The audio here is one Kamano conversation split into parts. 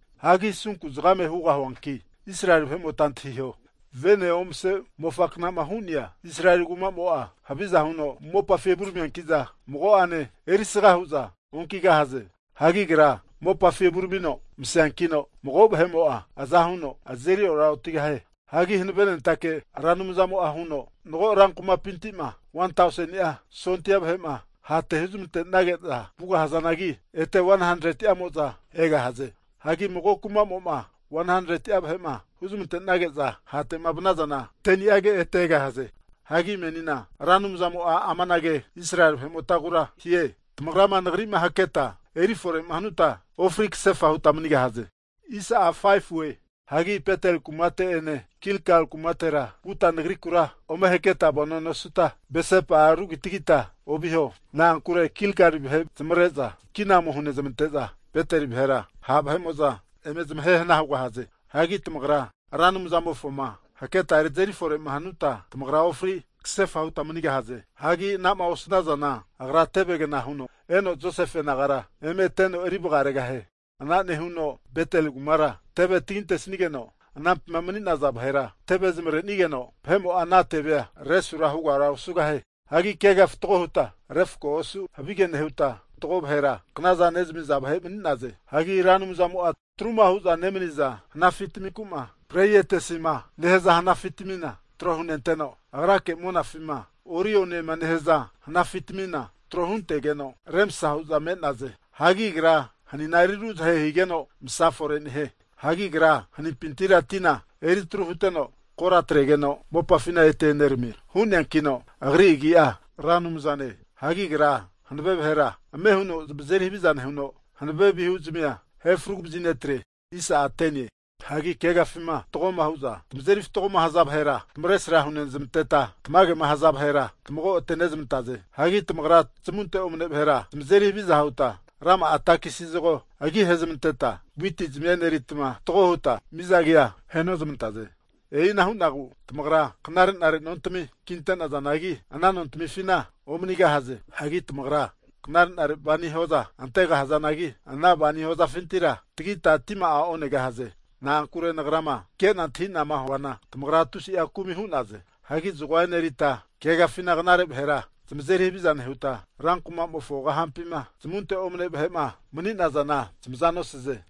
Hagi asunku zagame hugahuanki, Israeli vahe'mota antahiho, Vene omase mofa knama hu'nea Israeli kumamo'a, haviza huno mopafi evuramianki'za mago'ane erisaga hu'za onkigahaze. Hagi agra mopafi evuramino maseankino, mago vahe'mo'a aza huno azeri ora otigahie. Hagi Hanavenentake Ra Anumzamo'a huno, mago Israeli vahe rankumapinti'ma 1tauseni'a sondia vahe'ma hate huzmante'nage'za vugahazanagi, ete 100'a vahe'mo'za egahaze. Hagi mago kuma'mo'ma 100'a vahe'ma huzamante'nage'za hate'ma vanazana, 10ni'age ete egahaze. Hagi menina Ra Anumzamo'a amanage Israeli vahemotagura hie, Tamagrama nagri'ma haketa eri fore'ma hanuta ofri kasefa huta manigahze! Hagi Beteli kumate'ene Gilgali kumatera vuta nagrikura ome haketa vano nosuta, Beseba rugitagita oviho. Na'ankure Gigali vahe zamavare'za kina ome hunezmante'za Beteli vahera ha' vahe'mo'za eme zamahe hana hugahaze. Hagi tamagra Ra Anumzamofoma haketa azeri fore'ma hanuta, tamagra ofri kasefa huta manigahaze. Hagi ana'ma osanazana, Agra tevegna huno eno Josefe nagara eme teno eri vagaregahie. Ana nehuno Beteli kumara tevemo tesigeno, anampima mani'naza vahera teve zamare'nigeno, mago vahe'mo'a ana tevea resu hugara osugahie. Hagi keaga fatgo huta refkoa osu havige nehuta, fatgo vahera knaza nezami'za vahe mani'naze. Hagi Agra Ra Anumzamo'a atruma hu'za nemaniza hanafi taminku'ma Pleiadesiema nehaza hanafitamina tro hunenteno, Agrake monafima Orioniema nehaza hanafitamina tro huntege'za remsa hu'za me'naze. Hagi Agra hanina eri ruzahe higeno masa fore nehie. Hagi Agra hagerimpintira tina eri atru huteno kora atregeno, mopafina ete eneramie. Hu'neankino Agri agi'a Ra Anumzane. Hagi Agra hanave vahera ame huno zamazeri haviza nehuno, hanave vihuzmia ahe fragu vazinetre. Hagi keagafima fatgoma huza tamazeri fatgoma haza vahera tamavesra hunezamanteta, tamage'ma haza vahera tamago ate'nezmantaze. Hagi tamagra zamunte omane vahera zamazeri haviza huta rama'a takisi zago agi ahezamanteta witizmia enerita, fatgo huta miza agia ahenozmantaze. E'ina hu'nagu tamagra knare'nare nontami kinte'nazanagi ana nontamifina omanigahaze. Hagi tamagra knare'nare waini hoza ante'nazanagi, ana waini hozafintira tagita tima'a onegahaze. Na'ankure Nagrama kena antahinama huana, tamagra tusi'a kumi hu'naze. Hagi zagoa enerita keagafina knare vahera zamazeri haviza nehuta, rankumamofo kahampima zamunte omane vahe'ma mani'nazana zamaza nosaze.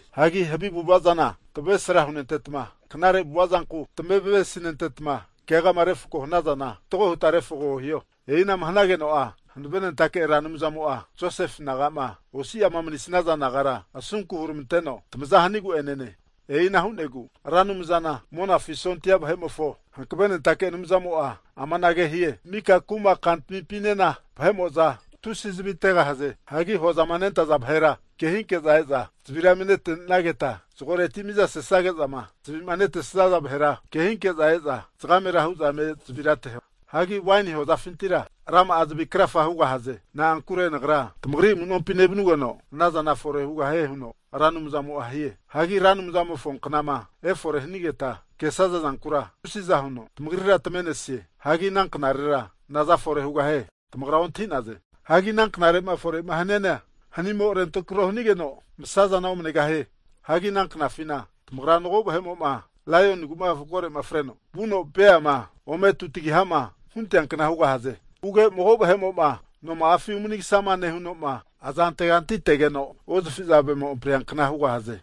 Hagi havi avu'ava zana tamavesra hunenteta, knare avu'avazanku tamavesinenteta, keagama refako hanazana fatgo huta refako hiho. E'ina'ma hanageno'a Hanavenentake Ra Anumzamo'a Josefe naga'ma osi'ama manisaza nagara asunku huramanteno tamaza hanigu'enene. E'ina hu'negu Ra Anumzana Monafi sondia vahe'mofo Hankavenentake Anumzamo'a amanage hie, mika kuma kantamipinena vahe'mo'za tusi zavi ategahaze. Hagi hozama nentaza vahera ke hinke'za eza zavira eme netenageta, zagoreti miza sazage'zama zavi'ma netaza vahera ke hinke'za eza zagamera eme hu'za zavira ateho. Hagi waini hozafintira rama'a zavi krafa hugahaze. Na'ankure Nagra tamagri amunompi nevanugeno anazana fore hugahie huno Ra Anumzamo'a hie. Hagi Ra Anumzamofo knama efore hanigeta kesaza zankura tusiza huno tamagrira tamave'nesie. Hagi ana knarera naza fore hugahie tamagra ontahi'naze. Hagi ana knare'ma fore'ma haniana, hanimo rentrako hanigeno masazana omanegahie. Hagi ana knafina tamagra mago vahe'mo'ma laionigu'ma koroma freno vuno beama ome tutagiha'ma huntea kna hugahaze. Huge mago vahe'mo'ma noma'afi umanigasama nehuno, aza anteganti antegeno osifavemo ampriankna hugahaze.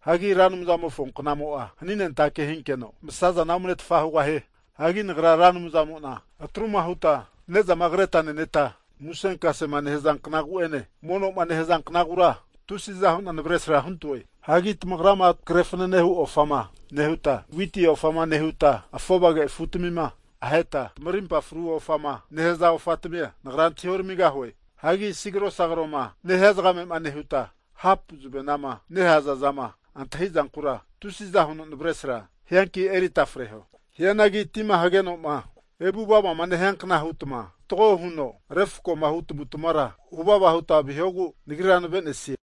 Hagi Ra Anumzamofo knamo'a haninentake hinkeno masazana omnetfa hugahie. Hagi Nagra Ra Anumzamo'na atruma huta ne'zama kreta neneta musenkasema nehaza knagu'ene mono'ma nehaza knagura tusiza hu'na navesra huntoe. Hagi tamagrama krefanane hu ofama nehuta, witi ofama nehuta, afovage afutamima aheta tamarimpa fru ofama nehaza ofatamia, Nagra antahi oramigahue. Hagi sigrosigroma nehia zagame'ma nehuta, hapu zavenama nehaza zama antahi zankura tusiza huno navesra hianki erita freho. Hianagi tima hageno'ma evu vavama nehiankna hutma fatgoma huno refkoma hu tamavu tamavara huvava huta vihogu Nagrira neve'nesie.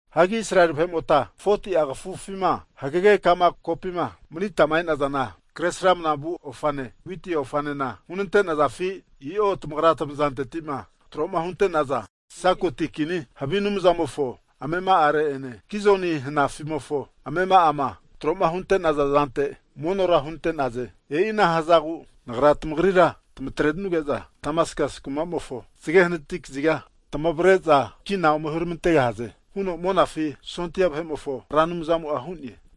Hagi Israeli vahe'mota 40'a kafufima hagege ka'ma kopima manita e'nazana Kresramana vu ofane, witi ofanena hunante'nazafi? I'o, tamagra'a tamazanteti'ma tro'ma hunte'naza Sakuti kini havi anumzamofo amema'are'ene, Kizuni hanafi'mofo amema'ama tro'ma hunte'naza zante monora hunte'naze. E'ina hazagu Nagra tamagrira tamatrenuge'za Damaskasi kumamofo zage hanati kaziga tamavre'za kina ome huramantegahaze huno Monafi sondia Vahemofo Ra Anumzamo'a hu'ne.